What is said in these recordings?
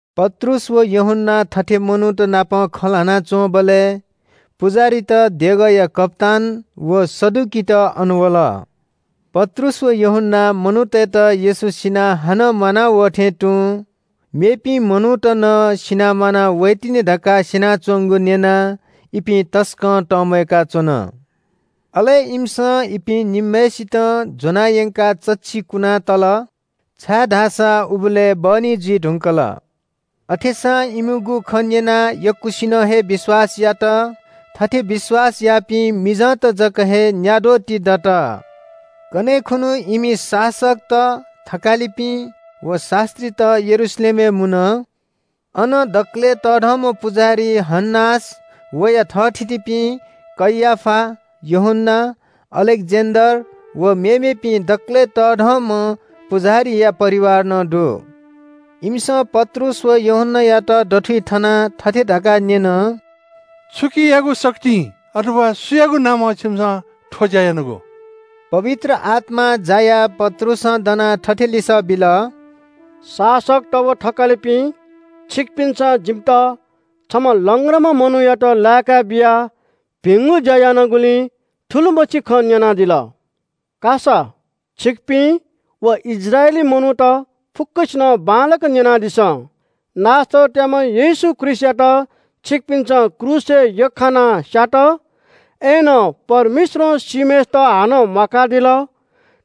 पत्रुस व यूहन्‍ना थथे मनूत नाप खँ ल्‍हाना च्‍वंबलय् पुजाहारीत, देगःया कप्‍तान व सदुकीत अन वल। पत्रुस व यूहन्‍नां मनूतय्‌त येशू सिनाः हानं म्‍वाना वः थें तुं मेपिं मनूत नं सिनाः म्‍वाना वइतिनि धकाः स्‍यनाच्‍वंगु न्‍यनाः इपिं तसकं तंम्‍वय्‌का च्‍वन। अले इमिसं इपिं निम्‍हय्‌सितं ज्‍वनायंकाः चच्‍छि कुनातल, छाय्‌धाःसा उबलय् बहनी जुइ धुंकल। अथेसां इमिगु खँ न्‍यनाः यक्‍वसिनं हे विश्‍वास यात। थथे विश्‍वास याःपिं मिजंत जक हे न्‍याद्वः ति दत। कन्‍हय् खुन्‍हु इमि शासकत, थकालिपिं व शास्‍त्रीत यरूशलेमय् मुन। अन दकलय् तःधंम्‍ह पुजाहारी हन्‍नास, वया थःथितिपिं कैयाफा, यूहन्‍ना, अलेक्‍जेन्‍डर व मेमेपिं दकलय् तःधंम्‍ह पुजाहारीया परिवार नं दु। इमिसं पत्रुस व यूहन्‍नायात दथुइ थनाः थथे धकाः न्‍यन – “छुकियागु शक्तिं, अथवा सुयागु नामं छिमिसं थ्‍व ज्‍या यानागु?” पवित्र आत्‍मां जायाः पत्रुसं दनाः थथे लिसः बिल – “शासकत व थकालिपिं, छिकपिन्‍सं जिमित छम्‍ह लंग्राम्‍ह मनूयात लाय्‌का बियाः भिंगु ज्‍या यानागुलिं थुलिमछि खँ न्‍यनादिल। का सा, छिकपिं व इस्राएली मनूत फुक्‍कसिनं बांलाक न्‍यनादिसँ – नासरतयाम्‍ह येशू ख्रीष्‍टयात छिकपिन्‍सं क्रूसय् यख्‍खानाः स्‍यात, अय्‌नं परमेश्‍वरं सीम्‍हय्‌सित हानं म्‍वाकादिल।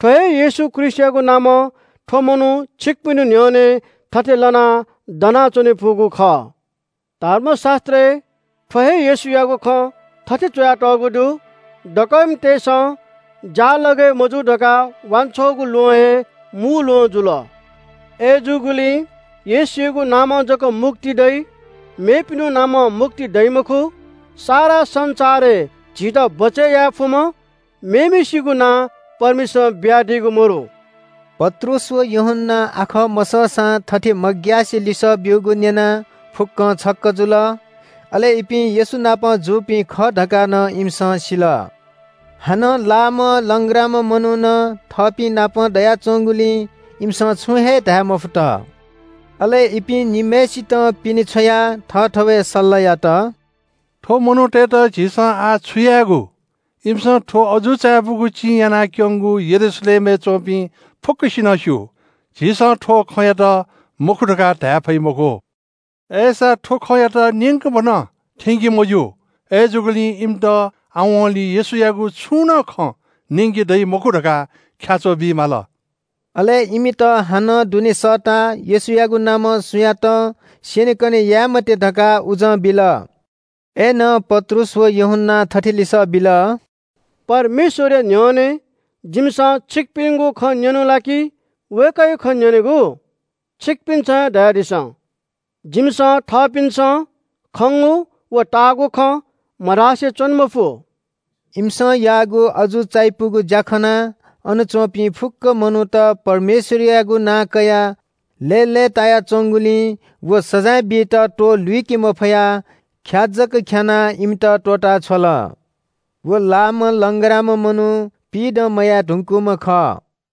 थ्‍व हे येशू ख्रीष्‍टयागु नामं थ्‍व मनू छिकपिनिगु न्‍ह्यःने थथे लनाः दनाच्‍वने फुगु खः। धर्मशास्‍त्रय् थ्‍व हे येशूयागु खँ थथे च्‍वयातःगु दु – “‘दकःमितय्‌सं ज्‍यालगय् मजू धकाः वांछ्वःगु ल्‍वहं हे मू ल्‍वहं जुल।’ “अय्‌जूगुलिं येशूयागु नामं जक मुक्ति दइ, मेपिनिगु नामं मुक्ति दइ मखु। सारा संसारय् झीत बचय् याये फुम्‍ह मेम्‍हय्‌सिगु नां परमेश्‍वरं बियादीगु मदु।” पत्रुस व यूहन्‍नां आखः मसःसां थथे मग्‍यासे लिसः ब्‍यूगु न्‍यनाः फुक्‍कं छक्‍क जुल। अले इपिं येशू नाप जूपिं खः धकाः नं इमिसं सिल। हानं लाःम्‍ह लंग्राम्‍ह मनू नं थःपिंनापं दनाच्‍वंगुलिं इमिसं छुं हे धाये मफुत। अले इपिं निम्‍हय्‌सितं पिने छ्वयाः थःथवय् सल्‍लाह यात – “थ्‍व मनूतय्‌त झीसं आः छु यायेगु? इमिसं थ्‍व अजू चायापुगु चिं यानाक्‍यंगु यरूशलेमय् च्‍वंपिं फुक्‍कसिनं स्‍यू। झीसं थ्‍व खँयात मखु धकाः धाये फइ मखु। अय्‌सां थ्‍व खँयात न्‍यंकभनं थ्‍यंके मज्‍यू। अय्‌जूगुलिं इमित आवंलि येशूयागु छुं नं खँ न्‍यंके दइ मखु धकाः ख्‍याच्‍वः बी माल।” अले इमित हानं दुने सःताः येशूयागु नामं सुयातं स्‍यनेकने याये मते धकाः उजं बिल। अय्‌नं पत्रुस व यूहन्‍नां थथे लिसः बिल – “परमेश्‍वरया न्‍ह्यःने जिमिसं छिकपिनिगु खँ न्‍यनेगु ला कि वय्‌कःयागु खँ न्‍यनेगु? छिकपिन्‍सं हे धयादिसँ। जिमिसं थःपिन्‍सं खंगु व ताःगु खँ मधासे च्‍वने मफु।” इमिसं याःगु अजू चायापुगु ज्‍या खनाः अन च्‍वंपिं फुक्‍क मनूत परमेश्‍वरयागु नां कयाः लय्‌लय् ताया च्‍वंगुलिं व सजाँय बीत त्‍वहः लुइके मफयाः ख्‍या जक ख्‍यानाः इमित त्‍वःता छ्वल। व लाःम्‍ह लंग्राम्‍ह मनू पिइदँ मयाये धुंकूम्‍ह खः।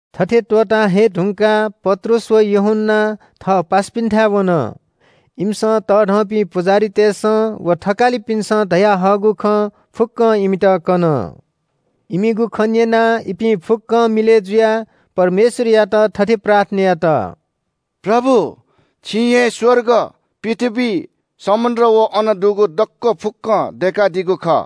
थथे त्‍वःता हये धुंकाः पत्रुस व यूहन्‍ना थः पासापिन्‍थाय् वन। इमिसं तःधंपिं पुजाहारीतय्‌सं व थकालिपिन्‍सं धयाहःगु खँ फुक्‍कं इमित कन। इमिगु खँ न्‍यनाः इपिं फुक्‍कं मिलय् जुयाः परमेश्‍वरयात थथे प्रार्थना यात – “प्रभु, छिं हे स्‍वर्ग, पृथ्‍वी, समुद्र व अन दुगु दक्‍व फुक्‍कं दय्‌कादीगु खः।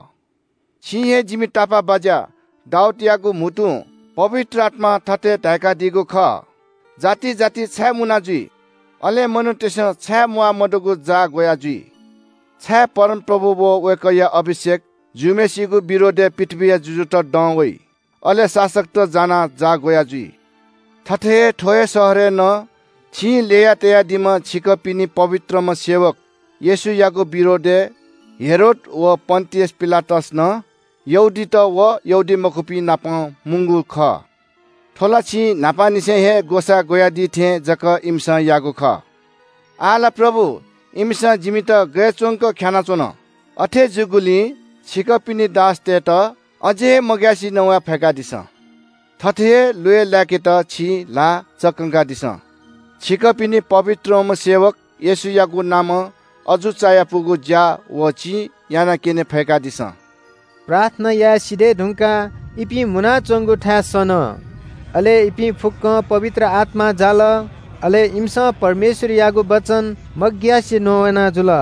छिं हे जिमि तापाःबाज्‍या दाऊदयागु म्‍हुतुं पवित्र आत्‍मां थथे धाय्‌कादीगु खः – “‘जाति जाति छाय् मुना जुइ? अले मनूतय्‌सं छाय् म्‍वाः मदुगु जाः ग्‍वयाजुइ? छाय् परमप्रभु व वय्‌कःया अभिषेक जूम्‍हय्‌सिगु विरोधय् पृथ्‍वीया जुजुत दं वइ, अले शासकत जानाः जाः ग्‍वयाजुइ?’” “थथे हे थ्‍व हे शहरय् नं छिं ल्‍यया तयादीम्‍ह छिकपिनि पवित्रम्‍ह सेवक येशूयागु विरोधय् हेरोद व पन्‍तियस पिलातस नं, यहूदीत व यहूदीमखुपिंनापं मुंगु खः। थ्‍व ला छिं न्‍हापांनिसें हे ग्‍वसाः ग्‍वयादी थें जक इमिसं याःगु खः। आः ला प्रभु, इमिसं जिमित गय् च्‍वंक ख्‍यानाच्‍वन। अथे जूगुलिं छिकपिनि दासतय्‌त अझ हे मग्‍यासे नवाये फय्‌कादिसँ। थथे हे ल्‍वय् लाय्‌केत छिं ल्‍हाः चकंकादिसँ। छिकपिनि पवित्रम्‍ह सेवक येशूयागु नामं अजू चायापुगु ज्‍या व चिं यानाक्‍यने फय्‌कादिसँ।” प्रार्थना याये सिधये धुंकाः इपिं मुनाच्‍वंगु थाय् सन। अले इपिं फुक्‍कं पवित्र आत्‍मां जाल। अले इमिसं परमेश्‍वरयागु वचन मग्‍यासे नवाना जुल।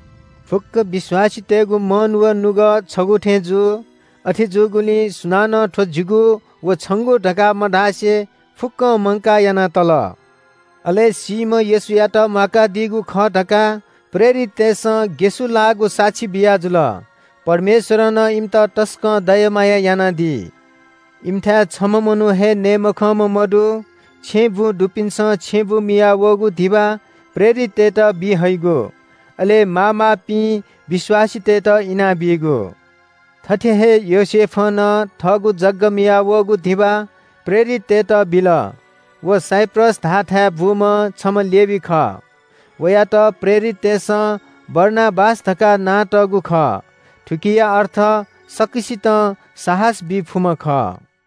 फुक्‍क विश्‍वासीतय्‌गु मन व नुगः छगू थें जू। अथे जूगुलिं सुनानं थ्‍व जिगु व छंगु धकाः मधासे फुक्‍कं मंकाः याना तल। अले सीम्‍ह येशूयात म्‍वाकादीगु खः धकाः प्रेरिततय्‌सं ग्‍यसुलाःगु साक्षी बियाजुल। परमेश्‍वरं नं इमित तसकं दया माया यानादी। इमिथाय् छम्‍ह मनू हे नये मखंम्‍ह मदु। छेँबुँ दुपिन्‍सं छेँबुँ मियाः वःगु धिबा प्रेरिततय्‌त बी हइगु, अले माःमाःपिं विश्‍वासीतय्‌त इनाबीगु। थथे हे योसेफं नं थःगु जग्‍गा मियाः वःगु धिबा प्रेरिततय्‌त बिल। व साइप्रस धाःथाय् बूम्‍ह छम्‍ह लेवी खः। वयात प्रेरिततय्‌सं बारनाबास धकाः नां तःगु खः। थुकिया अर्थ “सकसितं साहस बी फुम्‍ह” खः।